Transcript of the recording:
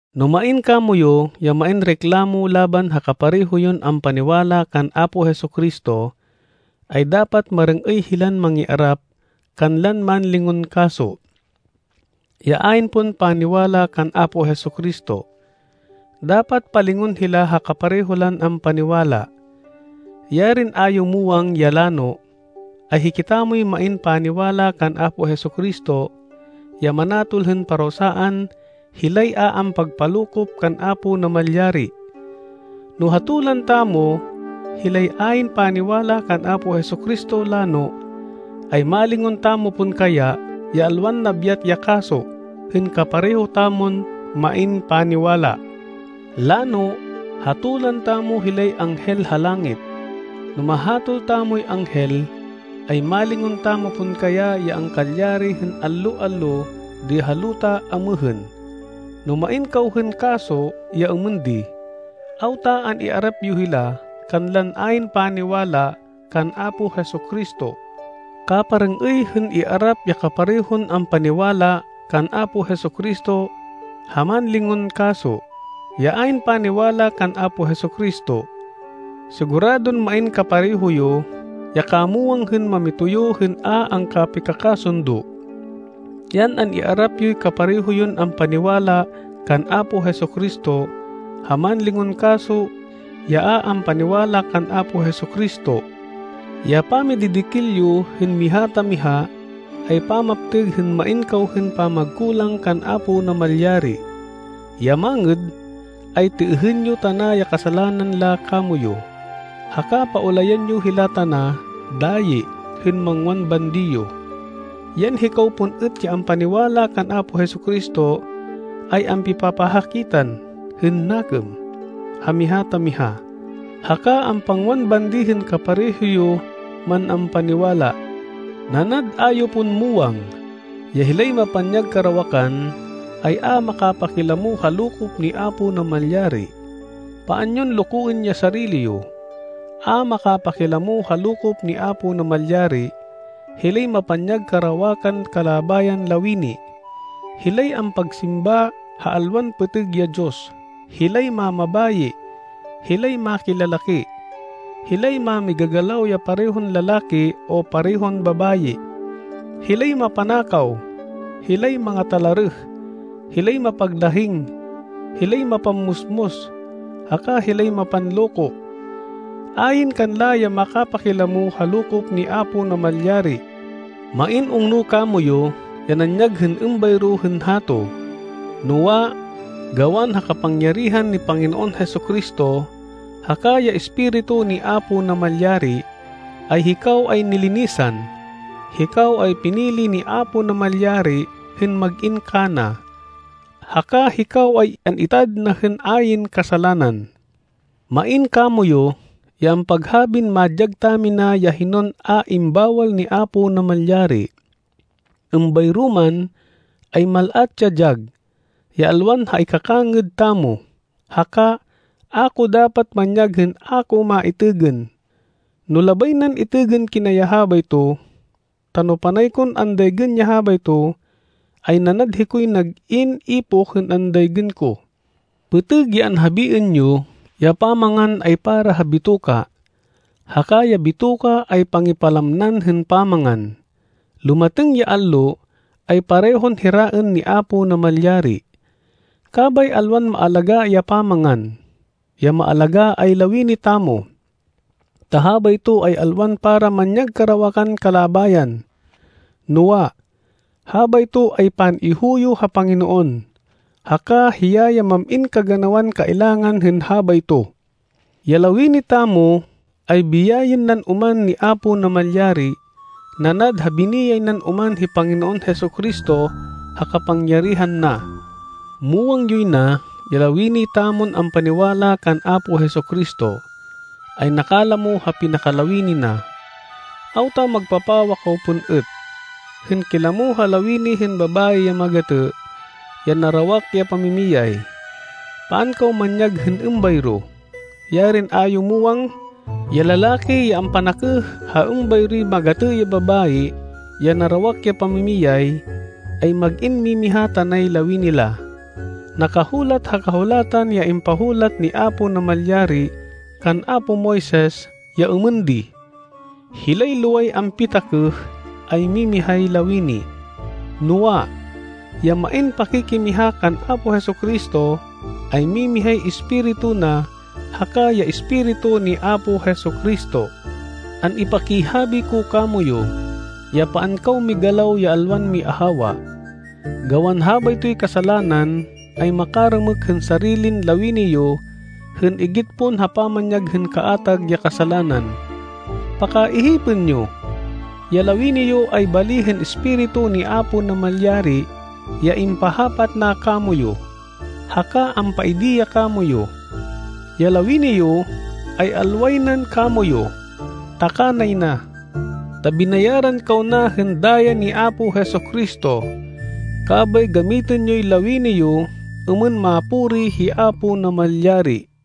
No main kamoyu ya main reklamo laban ha kapareho yon ampaniwala kan Apo Jesu-Cristo, ay dapat marêng-êy hilan mangiarap kanlan mánlingon kaso, ya ayn pon paniwala kan Apo Jesu-Cristo. Dapat palingon hila ha kapareho lan ampaniwala. Yarin a yo muwang ya lano, ay hikitamoy main paniwala kan Apo Jesu-Cristo, ya manatol hên parusaan hilay a ampagpalokop kan Apo Namalyari! No hatolan tamo hilay ayn paniwala kan Apo Jesu-Cristo lano, ay malingon tamo pon kaya ya alwan nabyat ya kaso hên kapareho tamon main paniwala! Lano, hatolan tamo hilay anghel ha langit. No mahatol tamoy anghel, ay malingon tamo pon kaya ya angkalyari hên allo-allo di ha luta amêhên? No main kaw hên kaso ya êmên di, awta an-iarap yo hila kanlan ayn paniwala kan Apo Jesu-Cristo? Kaparêng-êy hên iarap ya kaparehon ampaniwala kan Apo Jesu-Cristo, ha mánlingon kaso, ya ayn paniwala kan Apo Jesu-Cristo. Siguradon main kapareho yo ya kamwang hên mamitoyo hên a angkapikakasundo. Yan an-iarap yoy kapareho yon ampaniwala kan Apo Jesu-Cristo ha mánlingon kaso ya a ampaniwala kan Apo Jesu-Cristo. Ya pamididikil yo hên miha ta miha ay pamaptêg hên main kaw hên pamagkulang kan Apo Namalyari. Ya mangêd, ay têêhên yo tana ya kasalanan la kamoyu. Haka paulayan yo hila tana dayi hên mangwan bandi yo. Yan, hikaw pon êt ya ampaniwala kan Apo Jesu-Cristo, ay ampipapahakitan hên nakêm ha miha ta miha, haka ampangwan bandi hên kapareho yo man ampaniwala. Nanad a yo pon muwang, ya hilay mapanyag karawakan, ay a makapakilamo ha lokop ni Apo Namalyari. Paan yon lokoên ya sarili yo. A makapakilamo ha lokop ni Apo Namalyari, hilay mapanyag karawakan kalabayan lawini, hilay ampagsimba ha alwan pêtêg ya diyos, hilay mamabayi, hilay makilalaki, hilay mámigagalaw ya parehon lalaki o parehon babayi, hilay mapanakaw, hilay mangatalarêh, hilay mapaglahing, hilay mapammusmus, haka hilay mapanloko. Ayn kanla ya makapakilamo ha lokop ni Apo Namalyari. Main ungno kamoyu ya nanyag hên êmbayro hên hato. Noa, gawan ha kapangyarihan ni Panginoon Jesu-Cristo haka ya Espiritu ni Apo Namalyari, ay hikaw ay nilinisan, hikaw ay pinili ni Apo Namalyari hên mag-in kana, haka hikaw ay an-itad na hên ayn kasalanan. Main kamoyu, ya ampaghabin madyag tamina ya hinon a imbawal ni Apo Namalyari. Êmbayro man, ay mal-at ya dyag, ya alwan ha ikakangêd tamo. Haka a ko dapat manyag hên a ko maitêgên, no labay nan itêgên kina ya habayto. Ta no panay kon andaygên ya habayto, ay nanad hikoy nag-in ipoh hên andaygên ko. Pêtêg ya anhabiên yo ya pamangan ay para ha bitoka, haka ya bitoka ay pangipalamnan hên pamangan. Lumatêng ya allo ay parehon hiraên ni Apo Namalyari. Kabay alwan maalagá ya pamangan. Ya maalagá ay lawini tamo, ta habayto ay alwan para manyag karawakan kalabayan, noa, habayto ay pan-ihuyo ha Panginoon, haka hiya ya mam-in kaganawan kailangan hên habayto. Ya lawini tamo ay biyayên nan oman ni Apo Namalyari nanad ha biniyay nan oman hi Panginoon Jesu-Cristo ha kapangyarihan na. Muwang yoy na ya lawini tamon ampaniwala kan Apo Jesu-Cristo, ay nakalamo ha pinakalawini na. Awta magpapawa kaw pon êt, hên kilamo ha lawini hên babayi ya magatê, ya narawak ya pamimiyay? Paan kaw manyag hên êmbayro! Yarin a yo muwang, ya lalaki ya ampanakêh ha êmbayroy magatê ya babayi, ya narawak ya pamimiyay, ay mag-in mimiha tanay lawini la? Nakahulat ha Kahulatan ya impahulat ni Apo Namalyari kan apo Moises, ya êmên di, “Hilay loway ampitakêh ay mimihay lawini.” Noa, ya main pakikimiha kan Apo Jesu-Cristo, ay mimihay espiritu na haka ya Espiritu ni Apo Jesu-Cristo. An-ipakihabi ko kamoyu, ya paan kaw migalaw ya alwan miahawa. Gawan habaytoy kasalanan ay makarêmêk hên sarilin lawini yo hên igit pon ha pamanyag hên kaatag ya kasalanan. Pakaihipên yo, ya lawini yo ay bali hên Espiritu ni Apo Namalyari ya impahapat na kamoyu, haka ampaidi ya kamoyu. Ya lawini yo, ay alway nan kamoyu, ta kanay na. Ta binayaran kaw na hên daya ni Apo Jesu-Cristo, kabay gamitên yoy lawini yo êmên mapuri hi Apo Namalyari.